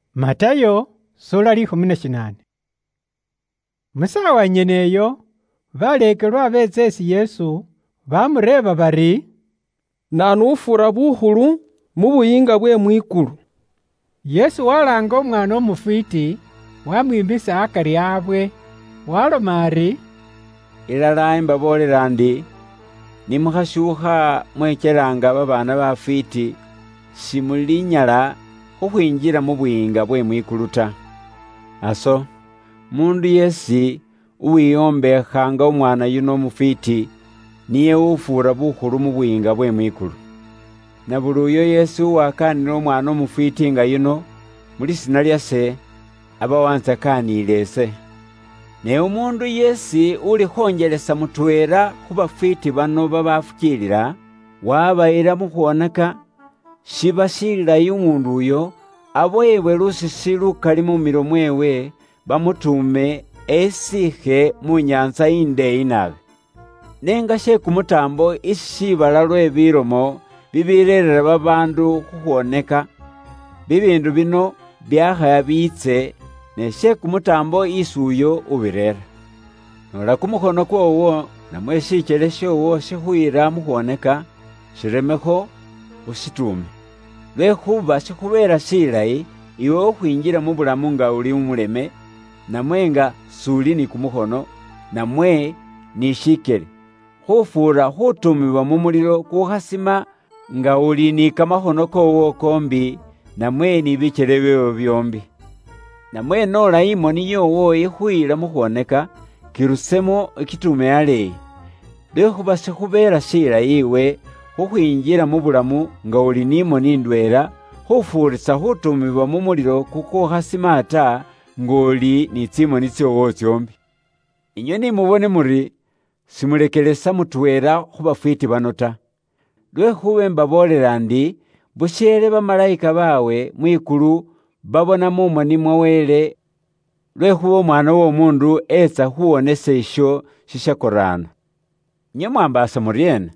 Naanu ufuura bukhulu? Mu saawa nyene iyo, baleekelwa beetsa isi Yesu, baamureeba bari, “Naanu ufuura bukhulu mu Buyiinga bwe mwikulu?” Yesu walaanga umwaana umufwiiti, waamwimisa akari awe, waaloma ari, “Ilala ise imbaboolela inywe ndi, ni mukhashuukha mwekyela nga babaana bafwiiti, simulinyala khukhwinjila mu Buyiinga bwe mwikulu ta. Aso, umuundu yeesi uwihombeekha nga umwaana yuno umufwiiti, niye ufuura bukhulu mu Buyiinga bwe mwikulu. Na buli uyo yeesi uwakaanila umwaana umufwiiti nga yuno, mu lisiina lyase, aba wantsakaaniile ise. “Ne umuundu yeesi ulikhonjelesa mutweela khu bafwiiti bano babaafukiilila, waabayila mu khwooneka, shiba shilayi umuundu uyo abowebwe lusisi lukali mu milo mweewe, bamutuume esiikhe mu nyaantsa indeeyi naabi. Ne nga she kumutaambo isi shiibala lwe bilomo bibireerera babaandu khukhwoneka! Bibiindu bino byaakha biitse, ne she kumutaambo isi uyo ubireera! “Noola kumukhono kwoowo namwe shikyele shoowo shikhuyila mu khwooneka, shiremekho, ushituume. Lwekhuuba shikhubeela shilayi iwe khukhwinjila mu bulamu bubukhawawo ta nga uli umuleme, namwe nga s'uli ni kumukhono, namwe ni shikyele, khufuura khutuumibwa mu mulilo kukhasima nga uli ni kamakhono kyoowo kyoombi, namwe ni bikyele byoowo byoombi. Namwe noola imoni yoowo ikhuyila mu khwooneka, kirusemo ukituume aleeyi. Lwekhuuba shikhubeela shilayi iwe khukhwinjila mu bulamu nga uli ni moni ndweela, khufuurisa khutuumibwa mu mulilo kukukhasima ta, nga uli ni tsimoni tsoowo tsoombi.” “Inywe ni mubone muri, simulekelesa mutweela khu bafwiiti bano ta. Lwekhuuba imbaboolela ndi busheele bamalayika baabwe mwikulu babona mu moni mwa Wele mwikulu. Lwekhuuba Umwaana w'Omuundu etsa khuwonesa ibo babakoraana. “Inywe mwaambaasa muryeena?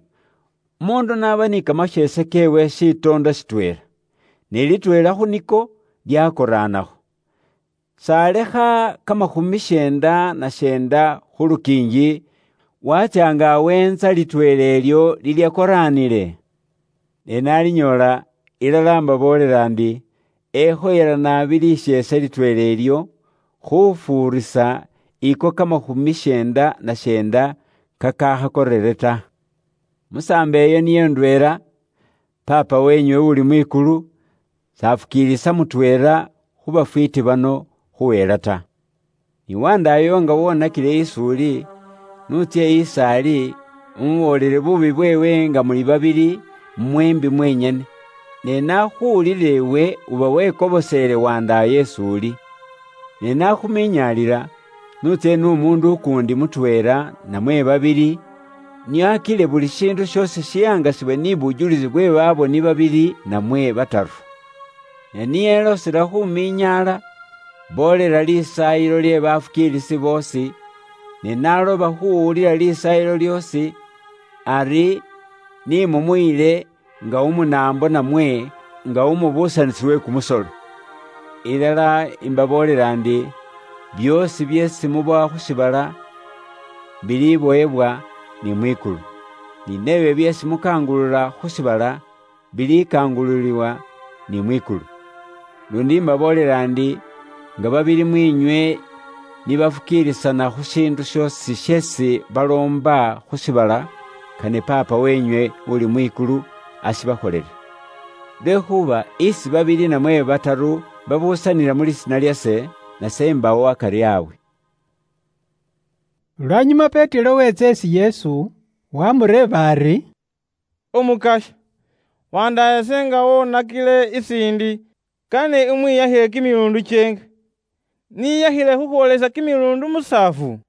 Umuundu n'aba ni kamasheese keewe shitoondo shitweela, ne litweela khu niko lyakoraanakho, s'alekha kamakhumi syeenda na syeenda khu lukiingi, waatsya nga aweentsa litweela ilyo lilyakoraanile? Ne n'alinyoola, ilala imbaboolela ndi, ekhoyela naabi lisheese litweela ilyo, khufuurisa iko kamakhumi syeenda na syeenda kakakhakorere ta. Musaambo iyo niyo ndweela, Paapa weenywe uli mwikulu, s'afukiilisa mutweela khu bafwiiti bano khuhela ta. “Ne nga umufukiilisi washoowo waakhukholilekho shishoonako, iwe n'utsye is'ali umuboolele buubi bweewe nga muli babili mweembi mwenyene. Nga wakhuwuliile iwe uba waamukobosele is'uli. Ne naakhuminyaalila, n'utsye n'umuundu ukuundi mutweela namwe babili, nio akile buli shiindu shoosi shihangasiwe ni bujulisi bwe baboni babili namwe bataru. Ne ni eloosela khuminyaala, boolela lisaayilo lye bafukiilisi boosi, ne n'aloba khuwulila lisaayilo lyoosi, ari ni mumuyile nga umunaambo namwe nga umubuusanisi we kumusolo. “Ilala imbaboolela ndi, byoosi byeesi mubowa khu shiibala, bilibowebwa ni mwikulu, ni nebyo byeesi mukangulula khu shiibala, bilikangululiwa ni mwikulu. Ilala, luundi imbaboolela ndi, nga babili mwiinywe ni bafukiilisana khu shiindu shoosi sheesi baloomba khu shiibala, kane Paapa weenywe uli mwikulu ashibakholele. Lwekhuuba isi babili namwe bataru babuusanila mu lisiina lyase, nase imbaawo akari abwe.” Lwanyuma Petero weetsa isi Yesu, waamureeba ari, “Umukasya, wandaayase nga woonakile isi indi, kane imwiyakhile kimiluundi kyeenga? Niyakhile khukhwoolesa kimiluundi musaafu?”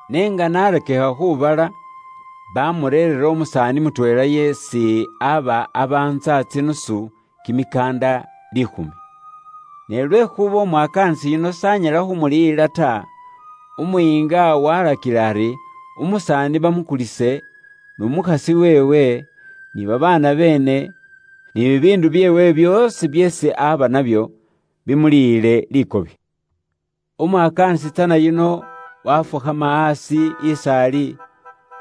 Ne nga n'arakikha khubala, bamureerera umusaani mutweela yeesi aba abaantsa tsinusu kimikaanda liikhumi. Ne lwekhuuba umwakaanisi yuno s'anyala khumuliyila ta, umuyiinga walakila ari umusaani bamukulise, n'umukhasi weewe, ni babaana beene, ni bibiindu byeewe byoosi byeesi aba nabyo, bimuliyile likobi. Umwakaanisi tsana yuno waafukhama aasi is'ali,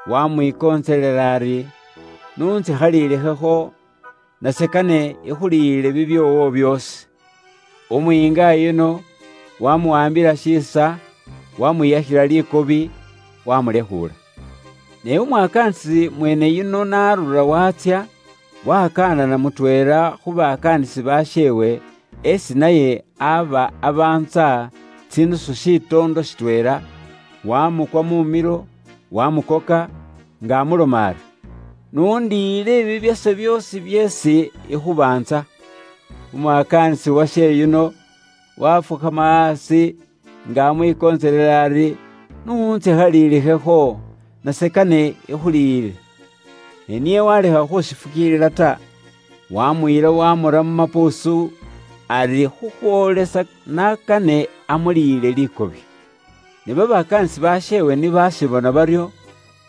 waamwikontselela ari, ‘N'untsikhalilikhekho, nase kane ikhuliyile bibyoowo byoosi.’ Umuyiinga yuno waamuwaambila shiisa, wamwiyakhila likobi, wamulekhuula. “Ne umwakaanisi mweene yuno n'arura waatsya, wakaanana mutweela khu bakaanisi basheewe, esi naye aba abaantsa tsidinari shitoondo shitweela, waamukwa mumilo, waarakikha khuumukoka, nga amuloma ari, ‘N'undiyile bibyase byoosi byeesi ikhubaantsa.’ Umwakaanisi washeewe yuno waafukhama aasi, nga amwikontselela ari, ‘N'untsikhalilikhekho, nase kane ikhuliyile.’ Ne niye waalekha khushifukiilila ta, waamuyila waamura mu mapuusu ari khukhwoolesa n'akane amuliyile likobi. Ne babakaanisi basheewe ni baashibona baryo,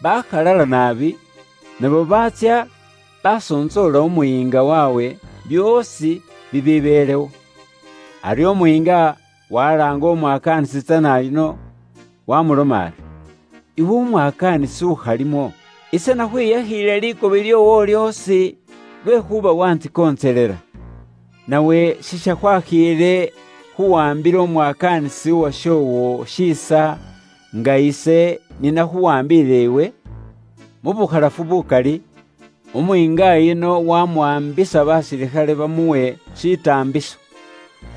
bakhalala naabi, nabo baatsya basontsoola umuyiinga waabwe byoosi bibibeelewo. Aryo umuyiinga walaanga umwakaanisi tsana yuno, waamuloma ari. ‘Iwe umwakaanisi ukhalimo, ise nakhwiyakhiile likobi lyoowo lyoosi, lwekhuuba waantsikontselela. Nawe sishakhwakhiile khuwaambila umwakaanisi uwashoowo shiisa, nga ise ni nakhuwaambiile iwe?’ Mu bukhalafu bukali, umuyiinga yuno waamuwaambisa basilikhale bamuwe shitaambiso,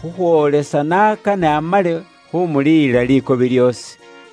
khukhwoolesa n'akane amale khumuliyila likobi lyoosi.”